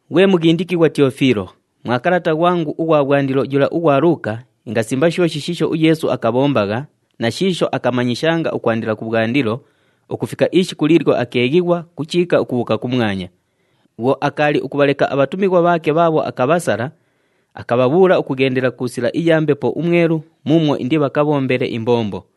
Ghwe mughindikighwa Tiyofiilo, mwa kalata ghwangu ughwa bhwandilo yula ughwa Luuka ingasimba shooshi shiisho uYeesu akabhombagha na shiisho akamanyishanga ukwandila kubhwandilo, ukufika ishiku liilyo akeeghighwa ku chiika ukubhuuka kumwanya. Bhwo akaali ukubhaleka abhatumighwa bhaake bhaabho akabhasala, akabhabhuula ukughendela ku sila iya Mbepo uMwelu muumwo indibhakabhombele imbombo.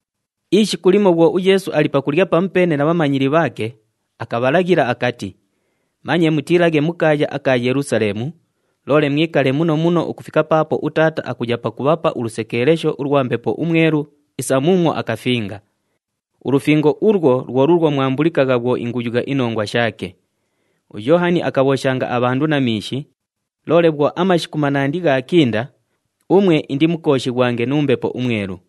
Ishiku limo bhwo uYeesu ali pakulya pamupeene na bhamanyili bhaake, akabhalaghila akati, “Manye mutiilaghe mu kaaya aka Yelusaleemu, loole mwikale muno muno ukufika paapo uTaata akuya pakubhapa ulusekeelesho ulwa Mbepo uMwelu isa muumwo akafinga. Ulufingo ulwo lwo luulwo mwambulikagha bhwo inguyugha inongwa shaake. UYoohani akabhooshanga abhandu na miishi, loole bhwo amashiku manandi ghaakinda, umwe indimukooshighwange nu Mbepo uMwelu.”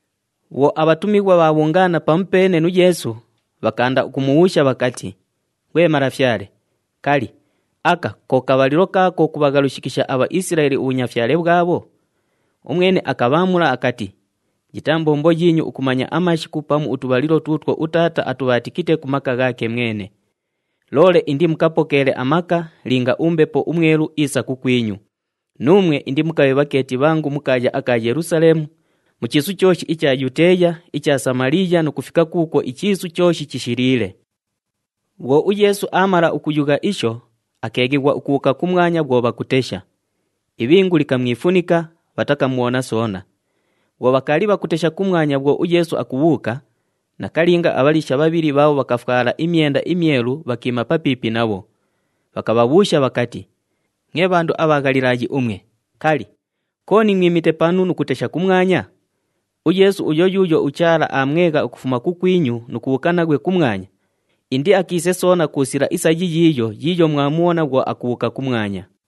Bhwo abhatumighwa bhaabhungaana pamupeene nu Yeesu, bhakaanda ukumubhuusha bhakati, “Ghwe Malafyale, kali, aka ko kabhalilo kaako kubhaghalushikisha aBhaisilaeli ubhunyafyale bhwabho?” Umwene akabhaamula akati, “Yitaa mbombo yiinyu ukumanya amashiku pamu utubhalilo tuutwo uTaata atubhaatikite ku maka ghaake mwene. Loole indimukapokeele amaka linga uMbepo uMwelu iisa kukwinyu, nuumwe indimukabhe bhakeeti bhangu mu kaaya aka Yelusaleemu, mu chiisu chooshi icha Yuteeya, icha Samaliiya nu kufika kuukwo ichiisu chooshi chishiliile.” Bhwo uYeesu aamala ukuyugha isho, akeeghighwa ukubhuuka kumwanya bhwo bhakutesha. Ibhingu likamwifunika, bhatakamubhona soona. Bhwo bhakaali bhakutesha kumwanya bhwo uYeesu akubhuuka, nakalinga abhaliisha bhabhili bhaabho bhakafwala imyenda imyelu bhakiima papiipi nabho. Bhakabhabhuusha bhakati, “Mwe bhandu abha Ghalilaayi umwe, kali, kooni mwimite panu nu kutesha kumwanya? UYeesu uyo yuuyo uChaala aamwegha ukufuma kukwinyu nu kubhuuka naghwe kumwanya, indiakiise soona ku sila isa yiyiiyo yiiyo mwamubhona bhwo akubhuuka kumwanya.”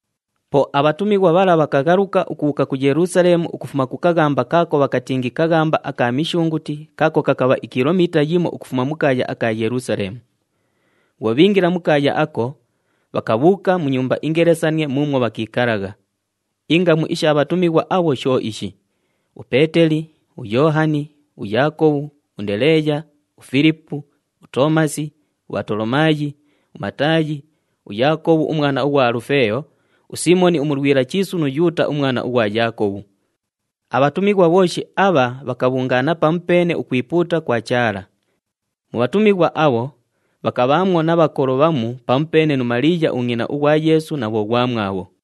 Po abhatumighwa bhala bhakaghaluka ukubhuuka ku Yelusaleemu ukufuma ku kaghamba kaako bhakatingi kaghamba aka Mishunguti kaako kakabha ikilomiita yimo ukufuma mu kaaya aka Yelusaleemu. Bhwo bhiingila mu kaaya ako, bhakabhuuka mu nyumba ingelesanie muumwo bhakiikalagha. Ingamu isha bhatumighwa abho sho ishi: uPeeteli, uYoohani, uYaakobhu, uNdeleeya, uFilipu, uToomasi, uBhatolomaayi, uMataayi, uYaakobhu umwana ughwa Alufeeyo, uSiimoni uMulwila Chiisu nu Yuuta umwana ughwa Yaakobhu. Abhatumighwa bhooshi abha bhakabhungaana pamupeene ukwipuuta kwa Chaala. Mu bhatumighwa abho, bhakabhaamwo na bhakolo bhamu pamupeene nu Maliiya ungʼina ughwa Yeesu na bhoghwamwabho.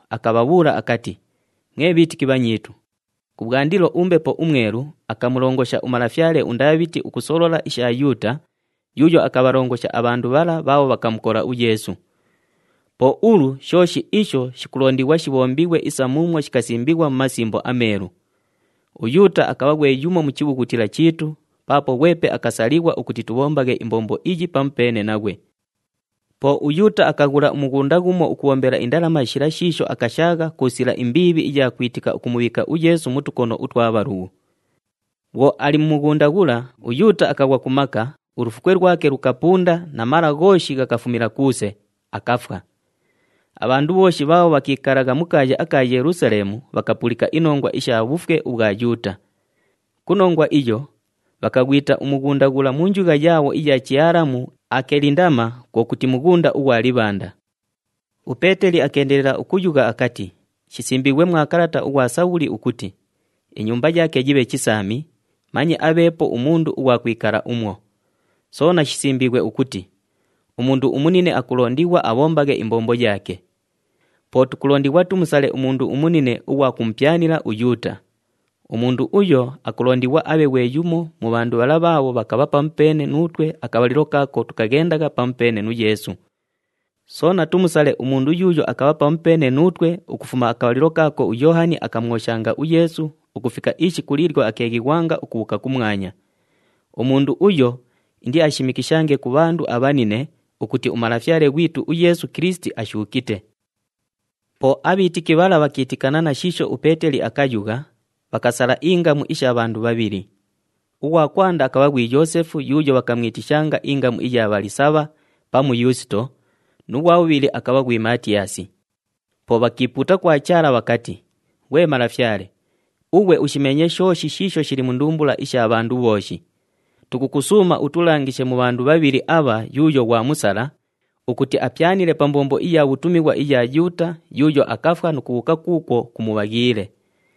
akabhabhuula akati, “Mwe bhiitiki bhanyiitu, kubhwandilo uMbepo uMwelu akamulongosha umalafyale uNdaabhiti ukusolola isha Yuuta yuuyo akabhalongosha abhandu bhala bhaabho bhakamukola uYeesu. Po ulu shooshi isho shikulondighwa shibhombighwe isa muumwo shikasimbighwa mu Masimbo aMeelu. UYuuta akabha ghwe yumo mu chibhughutila chiitu paapo ghwepe akasalighwa ukuti tubhombaghe imbombo iyi pamupeene naghwe.” Po uYuuta akaghula umughunda ghumo ukubhombela indalama shila shiisho akashaagha ku sila imbiibhi iya kwitika ukumubhiika uYeesu mu tukono utwa bhalughu. Bhwo ali mu mughunda ghula, uYuuta akaghwa ku maka, ulufukwe lwake lukapunda na mala ghooshi ghakafumila kuuse, akafwa. Abhandu bhooshi bhaabho bhakiikalagha mu kaaya aka Yelusaleemu bhakapulika inongwa isha bhufwe ubhwa Yuuta. Ku nongwa iyo, bhakaghwita umughunda ghula mu njugha yaabho iya Chialamu Akelindama, kwo kuti, “Mughunda ughwa Libhanda.” UPeeteli akeendelela ukuyugha akati, “Shisimbiighwe mwa kalata ughwa Sabhuli ukuti, ‘Inyumba yaake yibhe chisaami, manye abheepo umundu ughwa kwikala umwo.’ “Soona shisimbiighwe ukuti, ‘Umundu umunine akulondighwa abhombaghe imbombo yaake.’ “Po tukulondighwa tumusale umundu umunine ughwa kumupyanila uYuuta. Umundu uyo akulondighwa abhe ghwe yumo mu bhandu bhala bhaabho bhakabha pamupeene nuutwe akabhalilo kaako tukaghendagha pamupeene nu Yeesu. Soona tumusale umundu yuuyo akabha pamupeene nuutwe ukufuma akabhalilo kaako uYoohani akamwoshanga uYeesu ukufika ishiku liilyo akeeghighwanga ukubhuuka kumwanya. Umundu uyo indiashimikishange ku bhandu abhanine ukuti uMalafyale ghwitu uYeesu Kilisiti ashuukite.” Po abhiitiki bhala bhakiitikana na shiisho uPeeteli akayugha, bhakasala ingamu isha bhandu bhabhili. Ughwa kwanda akabha ghwi Yoosefu yuuyo bhakamwitishanga ingamu iya Bhalisabha pamu Yuusito nu ghwa bhubhili akabha ghwi Maatiyaasi. Po bhakiipuuta kwa Chaala bhakati, “Ghwe Malafyale, ughwe ushimeenye shooshi shiisho shili mu ndumbula isha bhandu bhooshi. Tukukusuuma utulangishe mu bhandu bhabhili abha yuuyo ghwamusala, ukuti apyanile pa mbombo iya bhutumighwa iya Yuuta yuuyo akafwa nu kubhuuka kuukwo kumubhaghiile.”